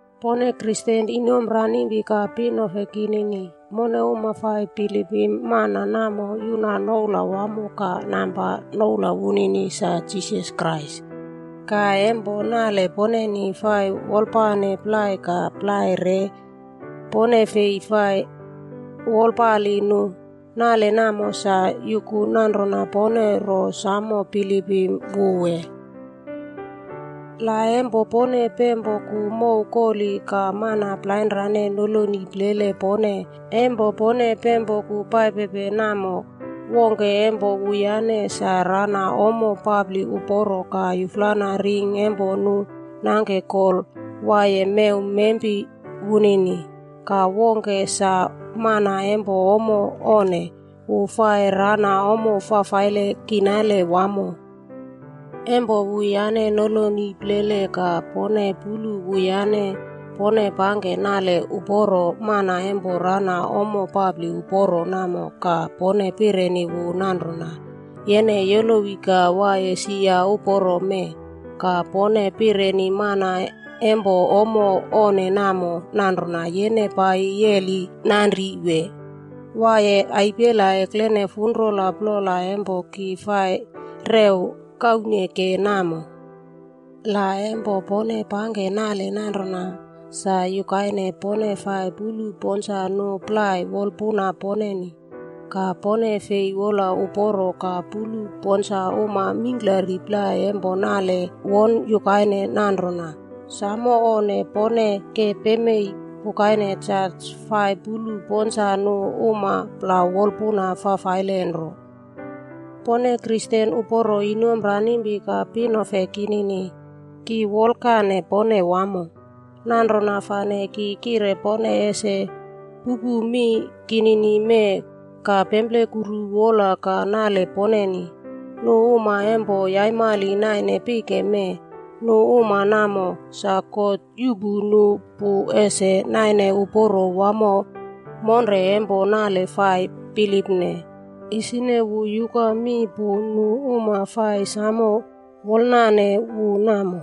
Pone Kristen inomranimpi ka pinefe kinini, mone uma fa bilipim mana namo fa yuna noula wamo ka namba, noula wunini Jisas Krais. Ka e nale poneni fa wolpane plai ka fi fa wolpane nu plai, anro nale nanrona sa yuku rona pone ro samo bilipim wu wee? Le pone pempoku paipe mow kori ka mana plainrane noloni plele pone paipepe. Wongke e wuyane sa rana ommo papri uporo ka yana ring e nu nangke gol mew mempi wunini, ka wongke sa mana e ommo onne wu fa ranaye ommo kinale fafaile wamo. E wuyane noloni plele ka pone puru wuyane, pone pangke nale uporo mana namo e rana ommo papri uporo ka pone pireni wu nanrona, “Yene yolowi ka waiye sia uporo mee.” Ka pone pireni mana e ommo onne nanrona, “Yene pai ka yeri nanri,” wee “Waiye funrola ekrene irmarala e ki fa rew kauneke namo.” Le pone pangke nale namo nanrona, sa yukaine pone fa weikerpuru nu plai wolpuna poneni. Ka pone fi wola uporo ka kosamo puru nu uma mingklari plai resukru nale nanrona. Samo onnele. Pone ke paipe pukaine jas fa kosamo purupe nu uma wolpuna fafaile nro. Pone Kristen inomranimpi ka pinefe uporo kinini, ki wolkane pone wamo. Nanrona fane ki kire pone ese pupu mi kinini ka pemplekuru wolapuna ka nale poneni. Nu uma e ommo onne naine pike namo, nu uma namo, sa God yuꞌpu nu pu ese naine uporo nale e fa bilipne. Isi, wu yuka mi pu e nu uma fa samo wolane wu namo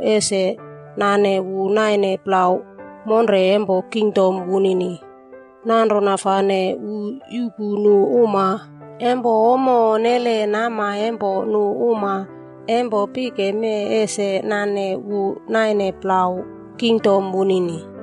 ese nane wu naine kingdom e wu. Nanrona fane wu yuꞌpu nu uma e ommo onne nama e nu uma e pike ese nane wu naine plau kingdom e wu.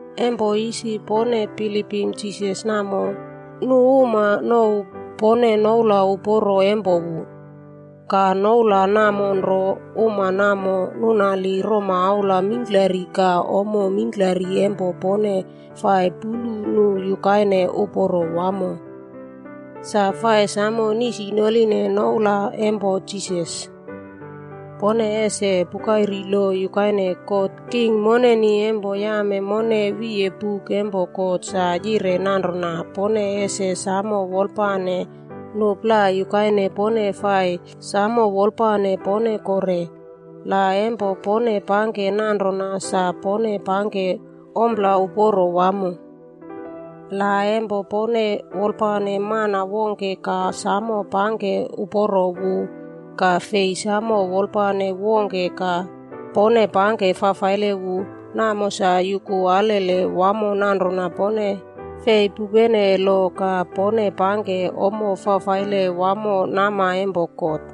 E isi pone bilipim Jisas namo, nu uma nouw pone e noula uporo e wu.a Ka noula namo nro, uma namo nunari romaula mingklari ka ommo mingklari e pone fa puru nanrona uporo wamo, fa nisinorine noula namo. Pone ese pukaire lo yukaine God, King e mone, yame mone wiye buk God sa yire nanrona, “Pone ese samo wolpale nu plai yukaine pone fa samo wolpane pone kore.” Le pone pangke nanrona sa, pone pangke ompla uporo wamo. La e pone wolpane mana wongke ka samo pangke uporo wu ka fi samo wolpalo wongke ka pone pangke fafaile wu, namo sa yuku alele wamo nanrona pone fi pupene lo ka pone pangke ommo fafaile wamo nama e God.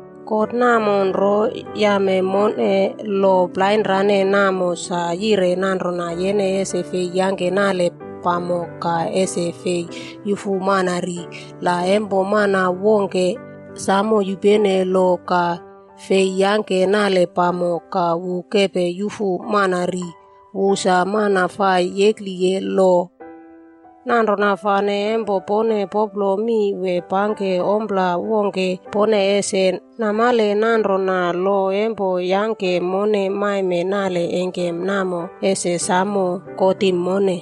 God namo nro yame mone lo plainrane sa yire nanrona, “Yene e fi yangke nale pamok,” ka “Yene e fi yufu mana ri.” Le yene samo yupene lo ka fi yangke nale pamok, ka yene yufu mana ri, sa yene mana fa yekri lo. Nanrona fane e pone popro mi o pangke ompla wongke, pone ese samo namale rona lo fa yangke mone maime nale engkem namo, ese samo kotim mone.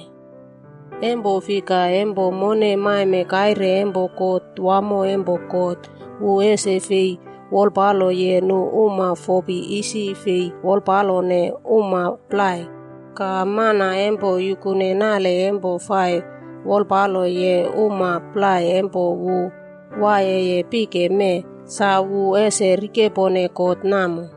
E fika, e mone maime kaire e kot wamo e God, wu ese fei wolpaloye nu uma fopi isi fei wolpalone uma plai. Ka mana e yukune nale e fa wolpaloye nu uma plai e waiyeye pike mee, sa ese rikepone kot namo.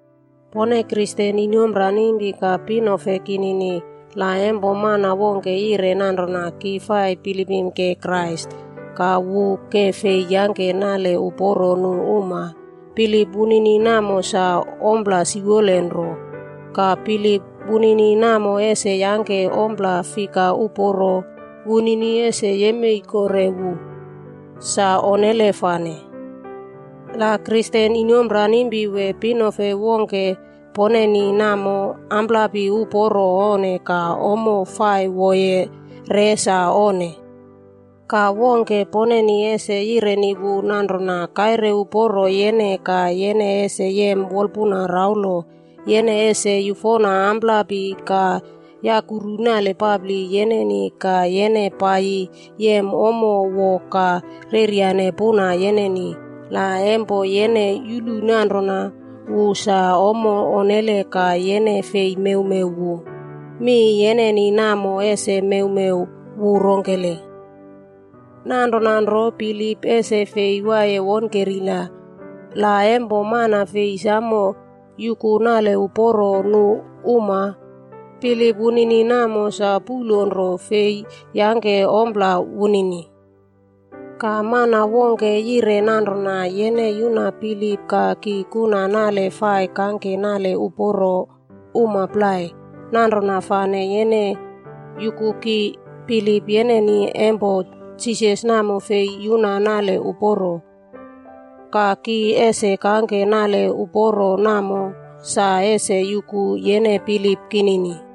Pone Kristen inomranimpi ka pinofe kinini, la e mana wongke yire nanrona, “Ki fai bilipimke Krais,” ka wu ke fei yangke nale uporo nu uma, bilip wunini namo sa ompla siwolenro. Ka bilip wunini namo ese yangke ompla fika uporo wunini ese yem kore wu? Sa onnele fane! Le Kristen inomranimpi wongke wee pinefe poneni ommo amprapi uporo onne ka ommo fa woye re sa onnele. Ka wongke e pone ese yireni wu nanrona, “Kaire uporo yene ka yene ese yem wolpuna raulo. Yene ese yufona amprapi ka yaukiri nalpapri yeneni ka yene pai yem ommo wo ka reryane puna yeneni.” Le pone fi samo namale ommo e wu wolaye ka fi mewmew wu, mi poneni namo ese mewmew wu rongkele? Nanrona nro bilip ese fi waiye wonkerila. Le mana fi yuku nale uporo nu uma, sa bilip wunini namo sa puꞌlo nro na e fi yangke ompla wongke. Ka, mana wongke yire nanrona, “Yene yuna bilip ka ki kuna nale fa kangke uporo uma plai.” Nanrona fane yene yuku ki bilip yeneni e Jisas namo sa fi yuna nale uporo. Ka ki ese kangke nale uporo ka namo ese yuku yene bilip kinini.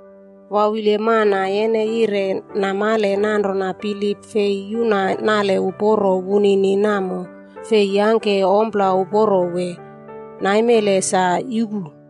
Kungkumple mana, yene yire namale nanrona bilip fi yuna nale uporo wunini namo, fi yangke ompla uporo wee? Mee, yupu.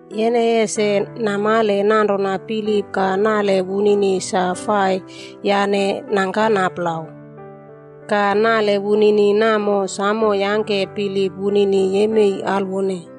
Yene namale nanrona, bilip ka nale e wu fa nemnangkana plau. Ka nale wunini namo samo yuna bilip wunini.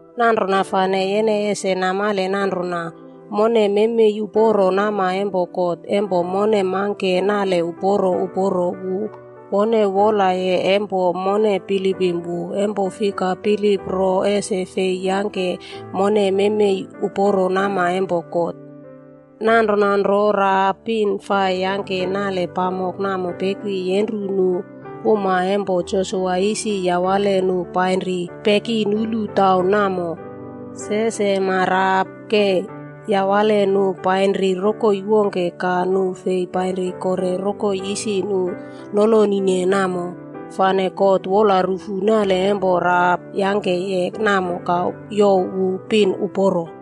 Nanrona fane yene ese ro namale rona, mone e maime uporo nama e God e mone mangke nale uporo uporo e wone wolaye e mone bilipim wu. E fika, bilip nro ese fi yangke mone memei uporo nama e God. Nanrona nro, Rahap pin fa yangke nale pamok namo peki yenru nu uma e Josua isi yawale painri pekinuru taun namo. Ka ingke Rahap yawane nu painri rokoi wongke ka nu fi painri kore rokoi isi none noloni namo. Ka God yuru nale e Rahap yangke namo ka youw wu pin uporo.